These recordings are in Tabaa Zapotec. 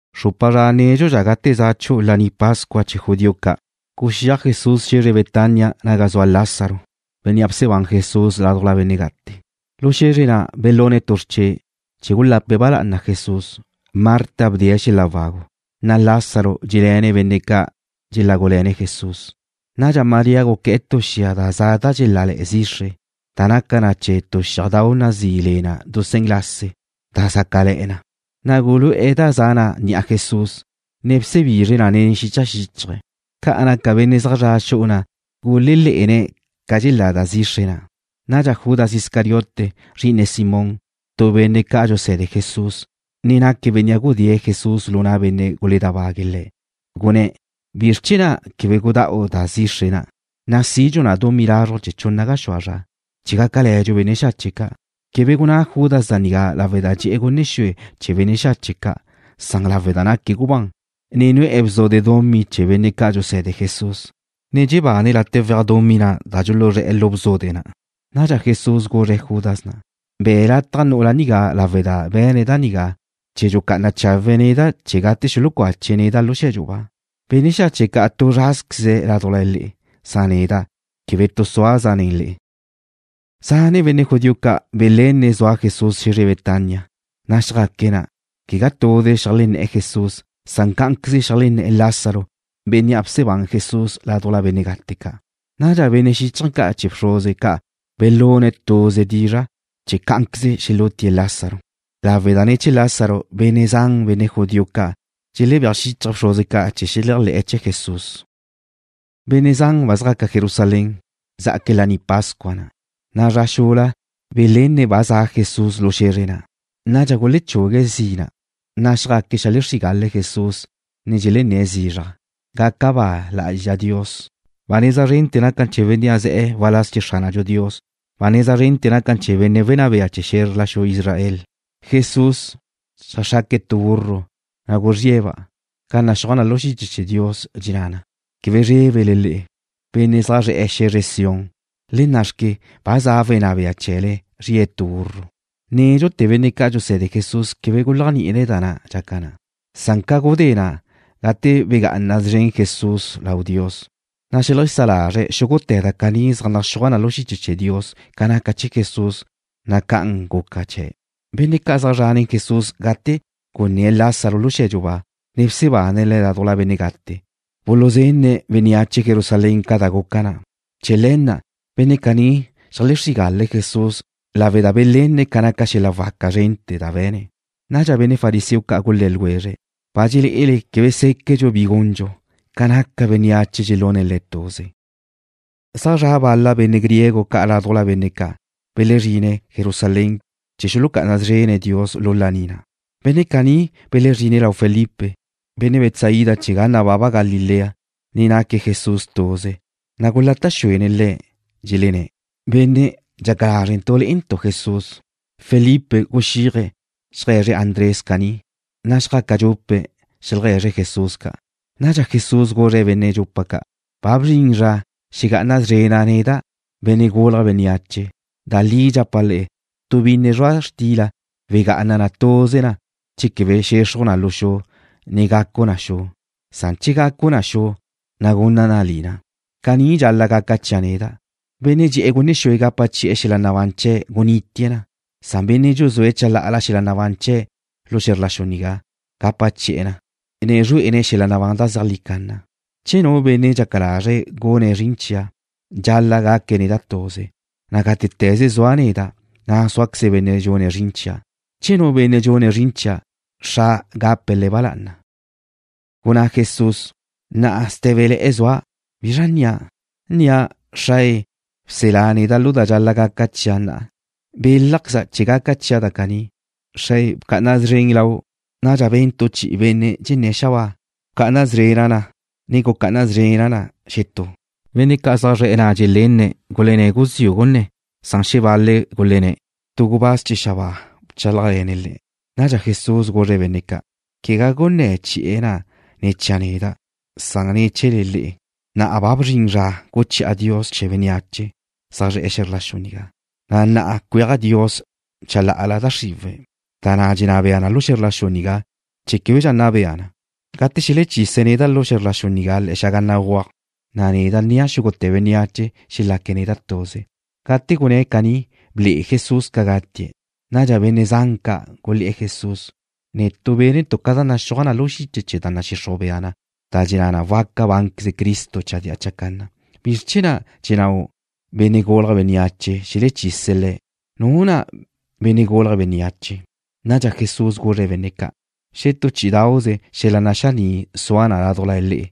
Xrupa zra nédxudxa gate za chu'u Laní Pascua chee̱ judío ca', guxíaj Jesús xe̱zre Betania naga zua Lázaro, bénnea' bsebán Jesús ládujla benne' gate'. Lu xe̱zre na' belune̱' tu xrche', chee̱ gulape̱' ba lá'ana Jesús. Marta bdee̱' xel-la' wagu, na' Lázaro dxé'le̱ne̱' benne' ca' dxelágule̱ne̱' Jesús. Nadxa María guqué̱'e̱ tu xia da za da dxelále̱'e̱ zixre, da naca na chee̱ dusén lase, da zácale̱'e̱ na, na' gulu'e̱ da za na' ni'a Jesús, ne bsebizre̱' na nen xicha xíchaje̱'. Ca naca benne' zaj zra' xu'u na' gulelé'ene̱' ca dxelá da zixre na'. Nadxa Judas Iscariote, zri'ine Simón, tu benne' ca' dxuse̱de Jesús, ne naque̱' bénnea' gudée̱' Jesús lu na' benne' guledábague̱' Le̱', gunné̱': ―¿Bizr chee̱ na' quebe gudá'u da zixre na', na' sidxu na dumí lazruj chee̱ chunna gaxúa zra chee̱ gácale̱dxu benne' xache' ca'? Quebe gunná Judas da nigá lawe' da dxe'e̱ gunne xue chee̱ benne' xache' ca'. Naque̱' gubán, ne nu'e̱ bzude dumí chee̱ benne' ca' dxuse̱de Jesús, ne dxebane̱' late' weaj dumí na' da dxuluzré̱'e̱ lu bzude na'. Nadxa Jesús guzre̱' Judas na': ―Be̱ lataj nu'ula nigá lawe' da be̱ne̱' da nigá chee̱ dxucá'ana chawe̱' neda' chee̱ gate xulucache̱' neda' lu xe̱dxu ba. Benne' xache' ca' tu zrázqueze̱' ládujla le'e. Neda' quebe tu súazqueza' nen le'e. Zane' benne' judío ca' belenne̱' zua Jesús xe̱zre Betania, na' xjaque̱' na', quegá tuze zeajlenné̱'e̱ Jesús. Cá'anqueze zeajlenné̱'e̱ Lázaro, bénnea' bsebán Jesús ládujla benne' gate ca'. Nadxa benne' xíchaje̱ ca' chee̱ bxruze ca' belune̱' tuze dizra' cá'anqueze xelútie̱' Lázaro, lawe' da ne̱ chee̱ Lázaro benne' zan benne' judío ca' dxelebéaj xíchaje̱' bxruze ca' chee̱ xeleajlé̱'e̱ chee̱ Jesús. Benne' zan ba zjaca Jerusalén, zjaque̱' Laní Pascua na', na' zra xula belenne̱' ba za' Jesús lu xe̱zre na'. Nadxa gulechugue̱' zina', na' xjaque̱' xeajlexrígale̱' Jesús, ne dxelenné̱' zizraj: ―¡Gaca ba lá'azxa Dios! ¡Ba neza zrente̱ naca na chee̱ Benne' ze̱'e̱ waláz chee̱ Xránadxu Dios! ¡Ba neza zrente̱ naca na chee̱ Wenná Bea chee̱ xe̱zre Israel! Jesús xeajxraque̱' tu burro, na' guzríe̱'-ba', ca naxúaj na lu xiche chee̱ Dios, dxenná na: Quebe zrébele le'e, benne' zre̱'e̱ xe̱zre Sión. Le nna'xque, ba za' Wenná Bea chee̱le. Zrie̱' tu burro. Nédxute̱ benne' ca' dxuse̱de Jesús quebe guléajni'ine̱' da na' dxaca na. Ca gudé na', gate begá'ana szren Jesús lau Dios, na' xeajlesá lazre̱' xúgute̱ da caní zaj naxúaj na lu xiche chee̱ Dios ca naca chee̱ Jesús, na' ca'an guca chee̱'. Benne' ca' zaj zre̱'e̱ nen Jesús gate gunné̱' Lázaro lu xe̱dxu ba, ne bsebane̱' le̱' ládujla benne' gate, buluzenne̱' bénneache Jerusalén ca da guca na'. Chee̱ le̱ na' benne' caní xeajlexrígale̱' Jesús lawe' da belenne̱' ca naca xel-la' waca zrente̱ da be̱ne̱'. Nadxa benne' fariseo ca' gulé̱ ljwezre̱': ―Ba dxelé'ele quebe séquedxu bi gundxu. Ca naca bénneache dxelune̱' Le̱' tuze. Zaj zra' bal-la benne' griego ca' ládujla benne' ca' belezrine̱' Jerusalén chee̱ xulucá'ana szrene̱' Dios lu laní na'. Benne' caní belezrine̱' lau Felipe, benne' Betsaida chee̱ ga nababa Galilea, ne naque̱' Jesús tuze, na' gulata' xuene̱' le̱', dxelenné̱': ―Benne', dxaca lázrentu' le'entu' Jesús. Felipe guxíaje̱' xeaje̱zre̱' Andrés caní, na' xjaca dxupe̱' xeajlegue̱zre̱' Jesús ca'. Nadxa Jesús guzre̱' benne' dxupa ca': ―Ba bzrin zra xegá'ana szrena' neda', Benne' Gulje̱' Bénneache. Da li dxapa' le'e, tu binne zrua' xtila wegá'ana na tuze na che quebe xexruj na lu xu, ne gacu na xu. Che gacu na xu, na' gunna na lina. Caní dxal-la' gaca chia' neda'. Benne' dxe'e̱ gunne xue gapa chi'e̱ xel-la' nabán chee̱' gunitie̱' na. Bénnea' dxuzúe̱' chalá'ala xel-la' nabán chee̱' lu xe̱zr la xu nigá, gapa chi'e̱ na, ne zrué'ene̱' xel-la' nabán da zeajlí canna. Che nu benne' dxaca lazre̱' gune̱' zrin chia', dxal-la' gaque̱' neda' tuze, na' gátete̱ze sua' neda', na' súaqueze benne' dxune̱' zrin chia'. Che nu benne' dxune̱' zrin chia', Xra' gape̱' le̱' ba lá'ana. Gunná Jesús: ―Na'a sté̱bele̱'e̱ zua'. ¿Bizra nnia'? ¿Nnia': Xrae, bselá neda' lu da dxal-la' gaca chia' na'a? Belájqueza' chee̱ gaca chia' da caní. Xrae, bca'ana szren lau'. Nadxa ben tu chi'i benne' dxenné̱' xabáa: ―Ba bca'ana szrena' na, ne gucá'ana szrena' na xetú. Benne' ca' zre̱'e̱ na' dxelenne̱' gulenné̱' guziu' gunné̱. Xebal-le̱' gulenné̱': ―Tu gubáz chee̱ xabáa bchálajle̱ne̱' Le̱'. Nadxa Jesús guzre̱' benne' ca': ―Quegá gunné̱ chi'e̱ na' ne̱ chia' neda'. Gunné̱ na ne̱ chee̱le le'e. Na'a ba bzrin zra guchi'a Dios chee̱ bénneache zre̱'e̱ xe̱zr la xu nigá, na' na'a cueaj Dios chalá'ala da xriwe̱', da na' dxenná bea na lu xe̱zr la xu nigá, chee̱ québedxa nna bea na. Gate xelechise̱' neda' lu xe̱zr la xu nigá le̱'e̱ xaga béguaj, na' neda' nnia' xúgute̱ bénneache chee̱ xelaque̱' neda' tuze. Gate gunné̱' caní, ble'e Jesús ca gatie̱'. Nadxa benne' zan ca' gulé̱'e̱ Jesús: ―Netu' bénentu' ca da naxúaj na lu xiche chee̱ da nadxixruj bea na da dxenná na waca bánqueze Cristo chadía chacanna. ¿Bizr chee̱ na' dxennáu' Benne' Gulje̱' Bénneache xelechise̱' Le̱'? ¿Nuzra na' Benne' Gulje̱' Bénneache? Nadxa Jesús guzre̱' benne' ca': ―Xetú chí'idauze xel-la' naxaní' sua na ládujla le'e.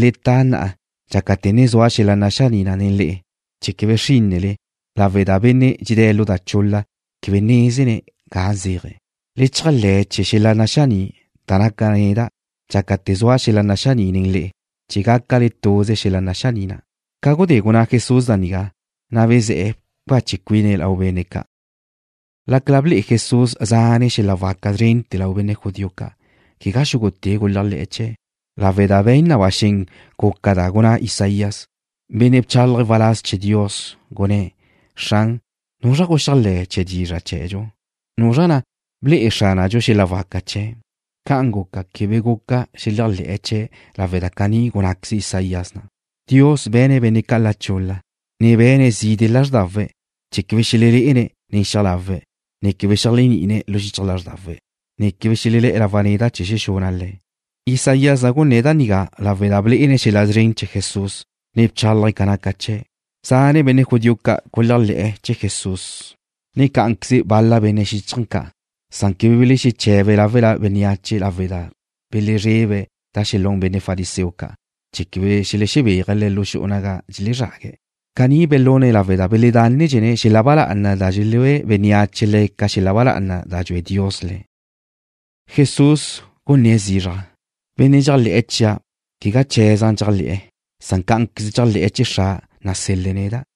Le ta na'a dxácate̱ ne zua xel-la' naxaní' nen le'e, chee̱ quebe xrínnele, lawe' da benne' dxedé̱' lu da chul-la quebe nézene̱' ga zéaje̱'. Le cheajlé̱ chee̱ xel-la' naxaní' da naca' neda' dxácate̱ zua xel-la' naxaní' nen le'e, chee̱ gácale tuze xel-la' naxaní' na'. Ca gudé gunná Jesús da nigá, na' bezé̱'e̱ bcache cuine̱' lau benne' ca'. Lácala ble'e Jesús zane' xel-la' waca zrente̱ lau benne' judío ca', quegá xúgute̱' guleajlé̱'e̱ chee̱', lawe' da be̱n na ba xen guca ca da gunná Isaías, benne' bchálaje̱' waláz chee̱ Dios, gunné̱': Xran, ¿nuzra guxeajlé̱ chee̱ dizra' chee̱dxu? ¿Nuzra na' ble'e Xránadxu xel-la' waca chee̱'? Ca'an guca, quebe guca xeleajlé̱'e̱ chee̱' lawe' da caní gunnáqueze Isaías na': Dios be̱ne̱' benne' ca' la chul-la, ne be̱ne̱' zide' lázrdawe̱', chee̱ quebe xelelé'ene̱' nen xiaj lawe̱', ne quebe xeléajni'ine̱' lu xichaj lázrdawe̱', ne quebe xelelé̱'e̱ lawa' neda' chee̱ xexuna' le̱'. Isaías na' gunné̱' da nigá lawe' da blé'ene̱' xel-la' szren chee̱ Jesús, ne bchálaje̱' ca naca chee̱'. Zane' benne' judío ca' guléajle̱'e̱ chee̱ Jesús, ne cá'anqueze bal-la benne' xíchaje̱ ca'. Quebe belexeche̱be̱' láwela bénneache lawe' da belezrebe̱' da xelún benne' fariseo ca', chee̱ quebe xelexebéaje̱' le̱' xu'u naga dxelezrague̱'. Caní belune̱' lawe' da beledánedxene̱' xel-la' ba lá'ana da dxelúe bénneache le̱' ca xel-la' ba lá'ana da dxue Dios le̱'. Jesús gunné̱' zizraj: ―Benne' dxéajle̱'e̱ chia', quegá chee̱za' dxéajle̱'e̱, cá'anqueze dxéajle̱'e̱ chee̱ Xra' nasel-le̱' neda'.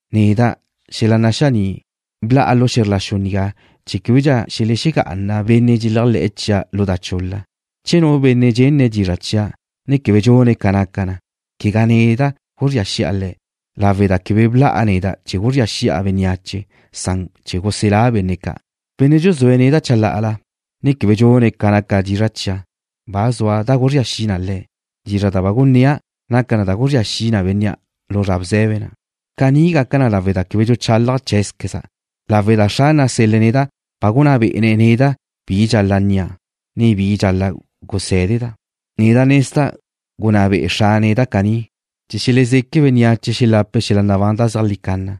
Neda', xel-la' naxaní', bla'a lu xe̱zr la xu nigá chee̱ québedxa xelexegá'ana benne' dxeléajle̱'e̱ chia' lu da chul-la. Che nu benne' dxenne̱' dizra' chia', ne quebe dxune̱' ca naca na, quegá neda' guzría xi'a le̱', lawe' da quebe bla'a neda' chee̱ guzría xi'a bénneache. Bla'a chee̱ guselá' benne' ca'. Benne' dxuzúe̱' neda' chalá'ala, ne quebe dxune̱' ca naca dizra' chia', ba zua da guzría xi na le̱'. Dizra' da ba gunnéa' naca na da guzría xi na bénnea' lu zra bze̱be na'. Caní gaca na lawe' da quebe dxuchálaja' cheé̱zqueza', lawe' da Xra' nasel-le̱' neda' ba gunná bé'ene̱' neda' bi dxal-la' nnia', ne bi dxal-la' gusé̱deda'. Neda' nezda' gunná be'e Xra' neda' caní chee̱ xelezeque bénneache xelape̱' xel-la' nabán da zeajlí canna.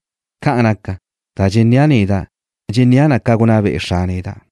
Ca'an naca, da dxennéa' neda', dxennéa' na ca gunná be'e Xra' neda'.